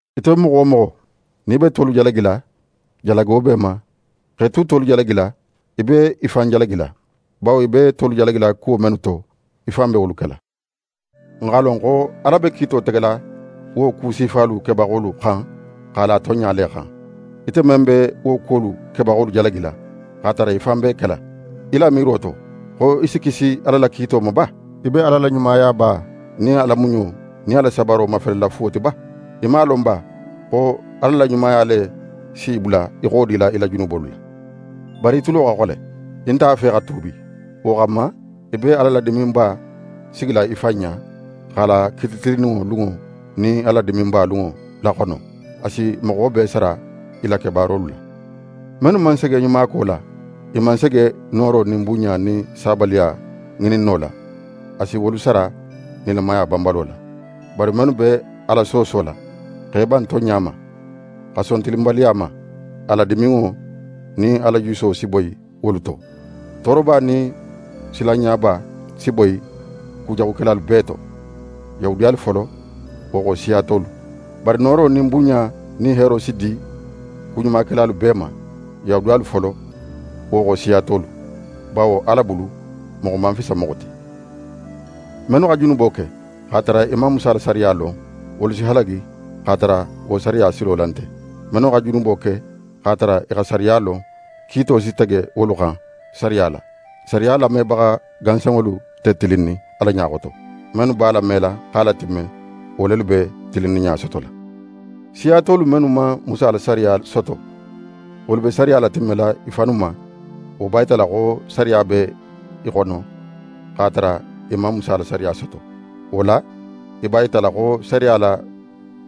Ite moxo wo moxo, nin í be tolu jalagila, jalago be í ma. X'é tu tolu jalagila, í be í fan jalagila, bawo í be tolu jalagila kuwo mennu to, í fan be wolu kela. N x'a lon xo Ala be kiito tegela wo ku sifalu kebaxolu xan x'a la tonɲa le xan. Ite men be wo kuwolu kebaxolu jalagila, x'a tara í fan b'e kela, í la miiro to xo í si kisi Ala la kiito ma ba? Í be Ala la ɲumayaba nin a la muɲo nin a la sabaro mafelela fuwo ti ba? Í man a lon ba, xo Ala la ɲumaya le si í bula í xodila í la junubolu la? Bari í tulo xa xole. Í nte a fe xa tuubi. Wo xanma, í be Ala la diminba sigila í fan ɲa, x'a la kiiti tilinninŋo lunŋo nin a la diminba lunŋo laxono. Ala si moxo bee sara i la kebaarolu la. Mennu man sege ɲumako la, i man sege nooro nin bunɲa nin sabaliya ŋininno la, a si wolu sara nilamaya banbalo la. Bari mennu be Ala soosola, x'e ban tonɲa ma, xa son tilinbaliya ma, a la diminŋo nin a la juso si boyi wolu to. Tooroba nin silanɲaba si boyi kujaxukelalu bee to: Yahudiyalu folo, wo xo siya tolu. Bari nooro nin bunɲa nin heero si di kuɲumakelalu bee ma: Yahudiyalu folo, wo xo siya tolu. Bawo Ala bulu, moxo man fisa moxo ti. Mennu xa junubo ke, x'a tara i man Musa la sariya lon, wolu si halagi x'a tara wo sariya silo la nte. Mennu xa junubo ke, x'a tara i xa sariya lon, kiito si tege wolu xan sariya la. Sariya lamebaxa gansanŋolu nte tilinnin Ala ɲa xoto. Mennu b'a lamela x'a latimme, wo lelu be tilinninɲa sotola. Siya tolu mennu man Musa la sariya soto, wolu be sariya latimmela i fannu ma. Wo b'a yitala xo sariya be i xono, x'a tara i man Musa la sariya soto. Wo la, i b'a yitala xo sariya la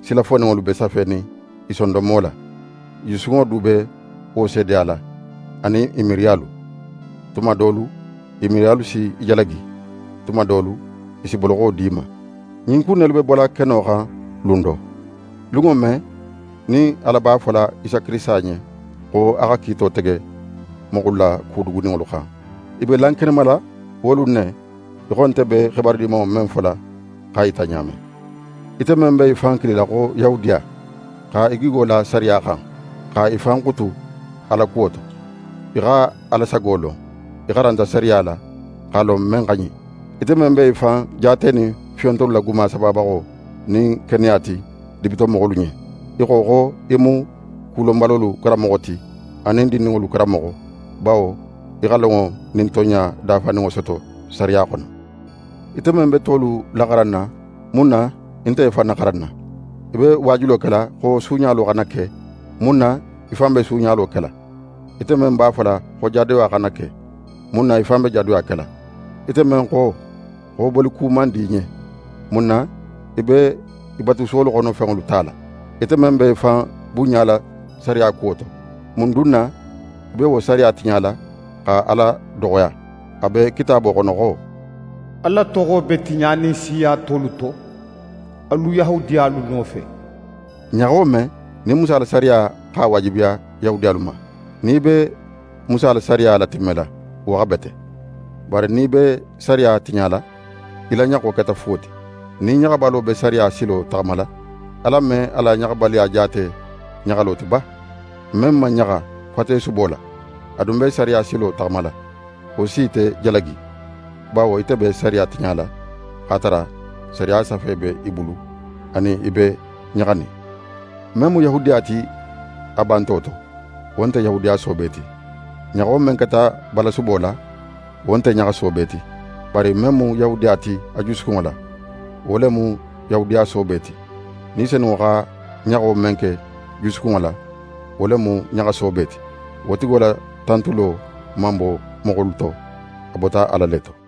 sila foninŋolu be safenin i sondonmo la. I jusukunŋo du be wo seedeyala, anin i miiriyalu. Tuma dolu i miiriyalu si i jalagi, tuma dolu i si boloxo di i ma. Ɲin ku in nelu be bola keno xan lun do. Lunŋo men, nin Ala b'a fola Isa Kirisita ɲen, xo a xa kiito tege moxolu la ku duguninŋolu xan, i be lankenemala wo lun ne, í xo nte be xibaru Dimanŋo men fola x'a yita ɲa men. Ite men be í fan kilila xo Yahudiya, xa í gigo la sariya xan, xa í fan xutu Ala kuwo to, í xa Ala sago lon. Í xaranta sariya la, x'a lon men xa ɲin. Ite men be í fan jaatenin fiyontolu la guma sababaxo nin keneya ti dibitomoxolu ɲen, í xo xo í mu ku lonbalolu xaranbaxo ti, anin dindinŋolu karanmoxo, bawo í xa lonŋo nin tonɲa dafaninŋo soto sariya xono. Ite men be tolu laxaranna, mun na í nte í fan naxaranna? Í be waajulo kela xo suuɲalo xana ke, mun na í fan be suuɲalo kela? Ite men b'a fola xo jadoya xana ke, mun na í fan be jadoya kela? Ite men xo, xo boliku man di í ɲen, mun na í be i batusuwolu xono fenŋolu tala? Ite men be í fan bunɲala sariya kuwo to, mun dun na í be wo sariya tiɲala xa Ala doxoya? A be Kitaabo xono xo: «Ala toxo be tiɲanin siya tolu to alu Yahudiyalu nofe.» Ɲaxo men, nin Musa la sariya x'a waajibiya Yahudiyalu ma, nin í be Musa la sariya latimmela, wo xa bete. Bari nin í be sariya tiɲala, í la ɲaxo keta fuwo ti. Nin ɲaxabalo be sariya silo taxamala, Ala me a la ɲaxabaliya jaate ɲaxalo ti ba? Men man ɲaxa fatesubo la, a dun be sariya silo taxamala, wo si ite jalagi, bawo ite be sariya tiɲala, x'a tara sariya safe be í bulu anin í be ɲaxanin. Men mu Yahudiya ti a banto to, wo nte Yahudiya soobe ti. Ɲaxo men keta balasubo la, wo nte ɲaxa soobe ti. Bari men mu Yahudiya ti a jusukunŋo la, wo le mu Yahudiya soobe ti. Ni Senunŋo xa ɲaxo men ke jusukunŋo la, wo le mu ɲaxa soobe ti. Wo tigo la tantulo man bo moxolu to, a bota Ala le to.